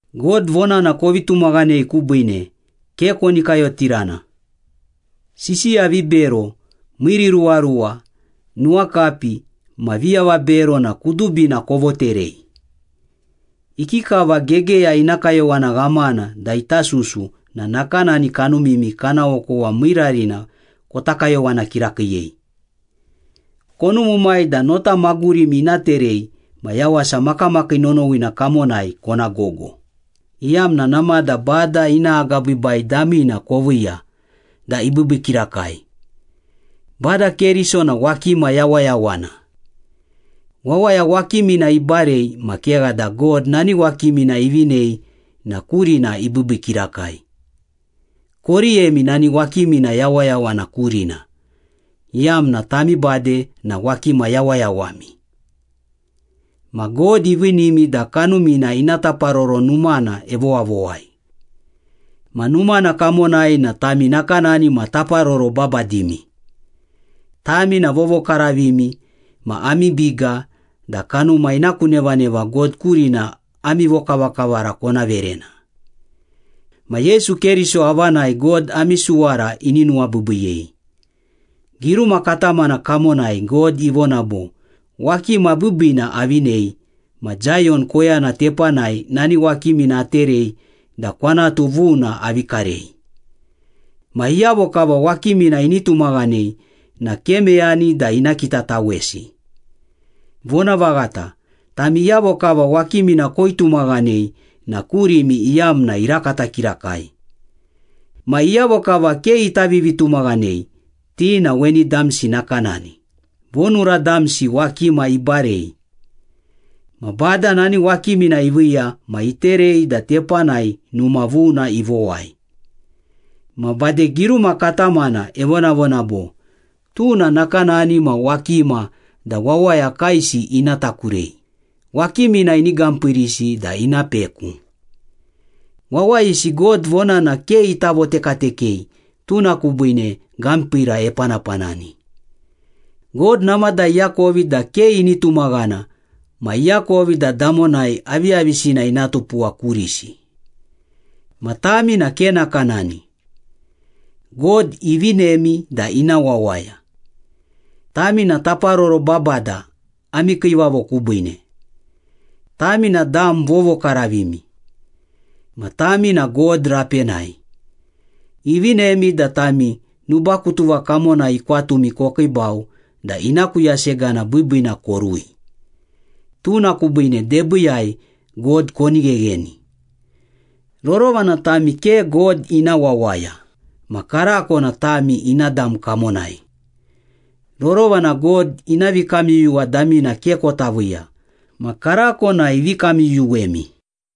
God vonana kovi tumaghanei kubiine, ke koni kayotirana. Sisiya vibero, miiriruwaruwa, nuwakapi ma viavabero na kudubina kovoterei. Ikikava gegeya ina kayowana ghamana da ita susu na nakanani kanumimi kana okowa miirarina kota kayowana kirakiiyei. Konumumai da nota magurimi ina terei ma yawasa makamakii nonowina kamonai kona gogo, iyamna namada Bada ina agabiibai damina koviiya da ibiibii kirakai. Bada Keriso na wakima yawayawana. Wawaya wakimina ibarei ma kegha da God nani wakimina ivinei na kurina ibiibii kirakai. Koriyemi nani wakimina yawayawana kurina, iyamna tami bade na wakima yawayawami. Ma God iviinimi da Kanumina ina taparoro numana evowavowai. Ma numana kamonai na tami nakanani ma taparoro babadimi. Tami na vovokaravimi ma ami biga da kanuma ina ku nevaneva God kurina ami vokavakavara kona verena. Ma Yesu Keriso avanai God ami suwara ini nuwabiibiyei. Giruma katamana kamonai God ivona bo, “Wakima biibiina avinei ma Zayon koyana tepanai nani wakimina aterei da kwanatu vuna avi karei. Ma iyavo kava wakimina ini tumaghanei na ke meyani da ina kitatawesi.” Vonavaghata, tami iyavo kava wakimina koitumaghanei na kurimi iyamna irakata kirakai. Ma iyavo kava ke ita vivitumaghanei, ti na weni damsi nakanani, “Vonura damsi wakima ibarei. Ma Bada nani wakimina iviiya ma iterei da tepanai numa vuna ivowai.” Ma bade giruma katamana evonavona bo, “Tuna nakanani ma wakima da wawaya kaesi ina takurei, wakimina ini gampiirisi da ina peku.” Wawayisi God vonana ke ita votekatekei tuna kubiine gampiira epanapanani. God namada iakovi da ke ini tumaghana ma iakovi da damonai aviyavisina ina tupuwa kurisi. Ma tami na ke nakanani. God ivinemi da ina wawaya. Tami na taparoro babada ami Kiivavo kubiine. Tami na dam vovokaravimi. Ma tami na God rapenai. Ivinemi da tami nubakutuva kamonai ikwatumi kokiibau da ina ku yasegana biibiina korui. Tuna kubiine debiiyai God koni ghegheni. Rorova na tami ke God ina wawaya, ma karako na tami ina dam kamonai. Rorova na God ina vikamyuyuwa damina ke kota viiya, ma karako na ivi kamyuyuwemi.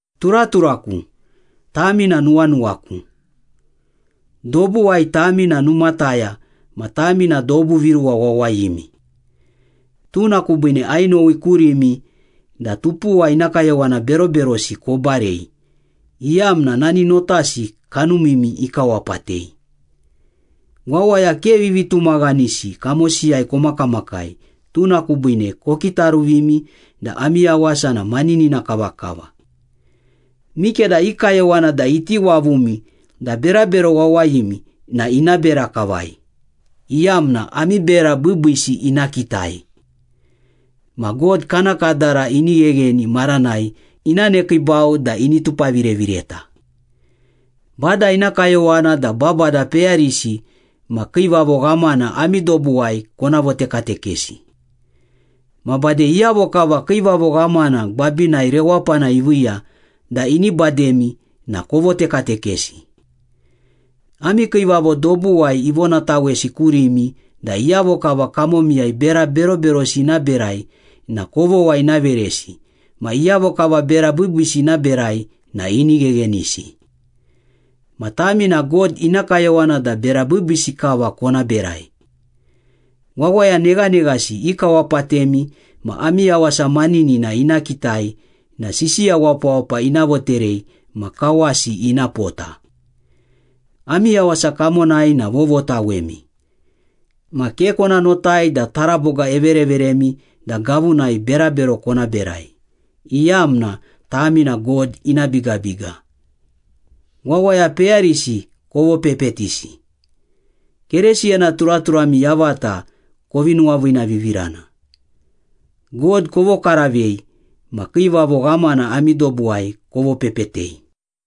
Turaturaku, tami na nuwanuwaku. Dobuwai tami na numataya ma tami na dobu viruwa wawayimi. Tuna kubiine ainowi kurimi da tupuwa ina kayowana beroberosi kobarei, iyamna nani notasi kanumimi ikawapatei. Wawaya ke vivitumaghanisi kamosiyai komakamakai, tuna kubiine kokitaruvimi da ami yawasa na maninina kavakava. Mikeda i kayowana da iti wavumi da berabero wawayimi na ina bera kavai, iyamna ami bera biibiisi ina kitai. Ma God kana kadara ini ghegheni maranai ina nekiibau da ini tupavirevireta. Bada ina kayowana da babada peyarisi ma kiivavo ghamana ami dobuwai kona votekatekesi. Ma bade iyavo kava kiivavo ghamana gwabinai rewapana iviiya da ini bademi na kovotekatekesi. Ami kiivavo dobuwai ivonatawesi kurimi da iyavo kava kamomiyai bera beroberosi ina berai na kovogha ina veresi ma iyavo kava bera biibiisi ina berai na ini gheghenisi. Ma tami na God ina kayowana da bera biibiisi kava kona berai. Wawaya neghaneghasi ikawapatemi ma ami yawasa maninina ina kitai na sisiya wapawapa ina voterei ma kawasi ina pota. Ami yawasa kamonai na vovotawemi. Ma ke kona notai da taraboga evereveremi da gavunai berabero kona berai, iyamna tami na God ina bigabiga. Wawaya peyarisi kovopepetisi. Keresiyana turaturami yavata kovi nuwaviinavivirana. God kovokaravei ma kiivavo ghamana ami dobuwai kovopepetei.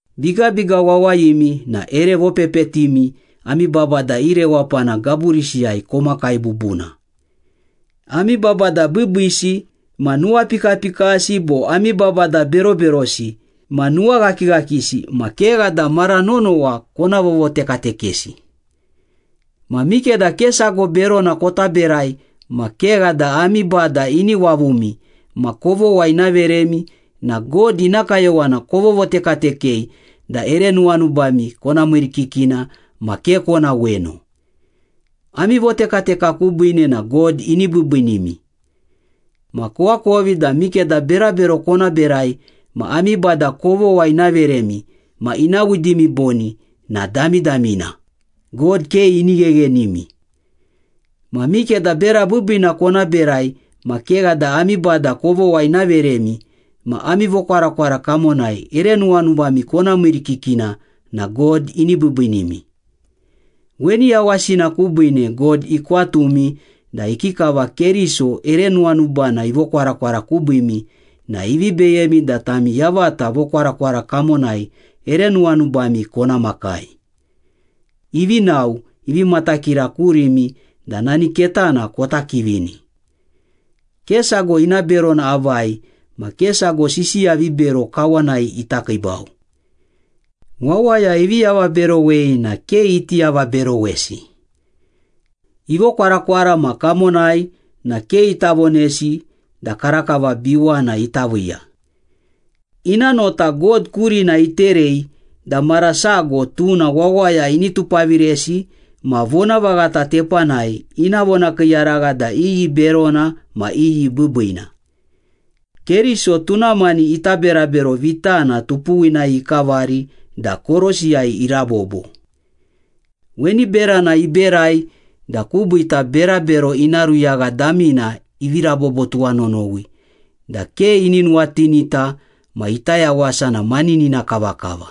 Bigabiga wawayimi na ere vopepetimi ami babada i rewapana gaburisiyai komakai bubuna. Ami babada biibiisi ma nuwapikapikasi bo ami babada beroberosi ma nuwaghakighakisi ma kegha da mara nonowa kona vovotekatekesi. Ma mikeda ke sago berona kota berai ma kegha da ami bada ini wavumi ma kovogha ina veremi na God ina kayowana kovotekatekei da ere nuwanubami kona miirikikina ma ke kona weno. Ami votekateka kubiine na God ini biibiinimi. Ma koakovi da mikeda berabero kona berai ma ami bada kovogha ina veremi ma ina widimi boni na damidamina, God ke ini gheghenimi. Ma mikeda bera biibiina kona berai ma kegha da ami bada kovogha ina veremi ma ami vokwarakwara kamonai ere nuwanubami kona miirikikina na God ini biibiinimi. Weni yawasina kubiine God ikwatumi da ikikava Keriso ere nuwanubana ivokwarakwara kubiimi na ivi beyemi da tami yavata vokwarakwara kamonai ere nuwanubami kona makai. Ivi nao, ivi matakira kurimi da nani ketana kota kivini. Ke sago ina berona avai ma ke sago sisiya vibero kawanai ita kiibau. Wawaya ivi avaberowei na ke iti avaberowesi. Ivokwarakwara ma kamonai na ke ita vonesi da karakava biwana ita viiya. Ina nota God kurina iterei da mara sago tuna wawaya ini tupaviresi ma vonavaghata tepanai ina vonakiiyaragha da iyi berona ma iyi biibiina. Keriso tuna mani ita berabero vitana tupuwinai ikavari da korosiyai irabobo. Weni berana iberai da kubiita berabero ina ruyagha damina ivi rabobo tuwanonowi da ke ini nuwatinita ma ita yawasa na maninina kavakava.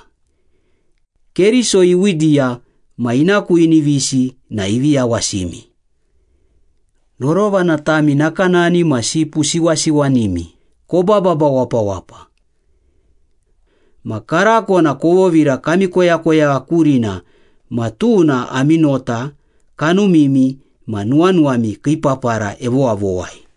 Keriso iwidiya ma ina ku inivisi na ivi yawasimi. Rorova na tami nakanani ma sipu siwasiwanimi, kobababa wapawapa. Ma karako na kovovira kami koyakoyagha kurina ma tuna ami nota, kanumimi ma nuwanuwami kii papara evowavowai.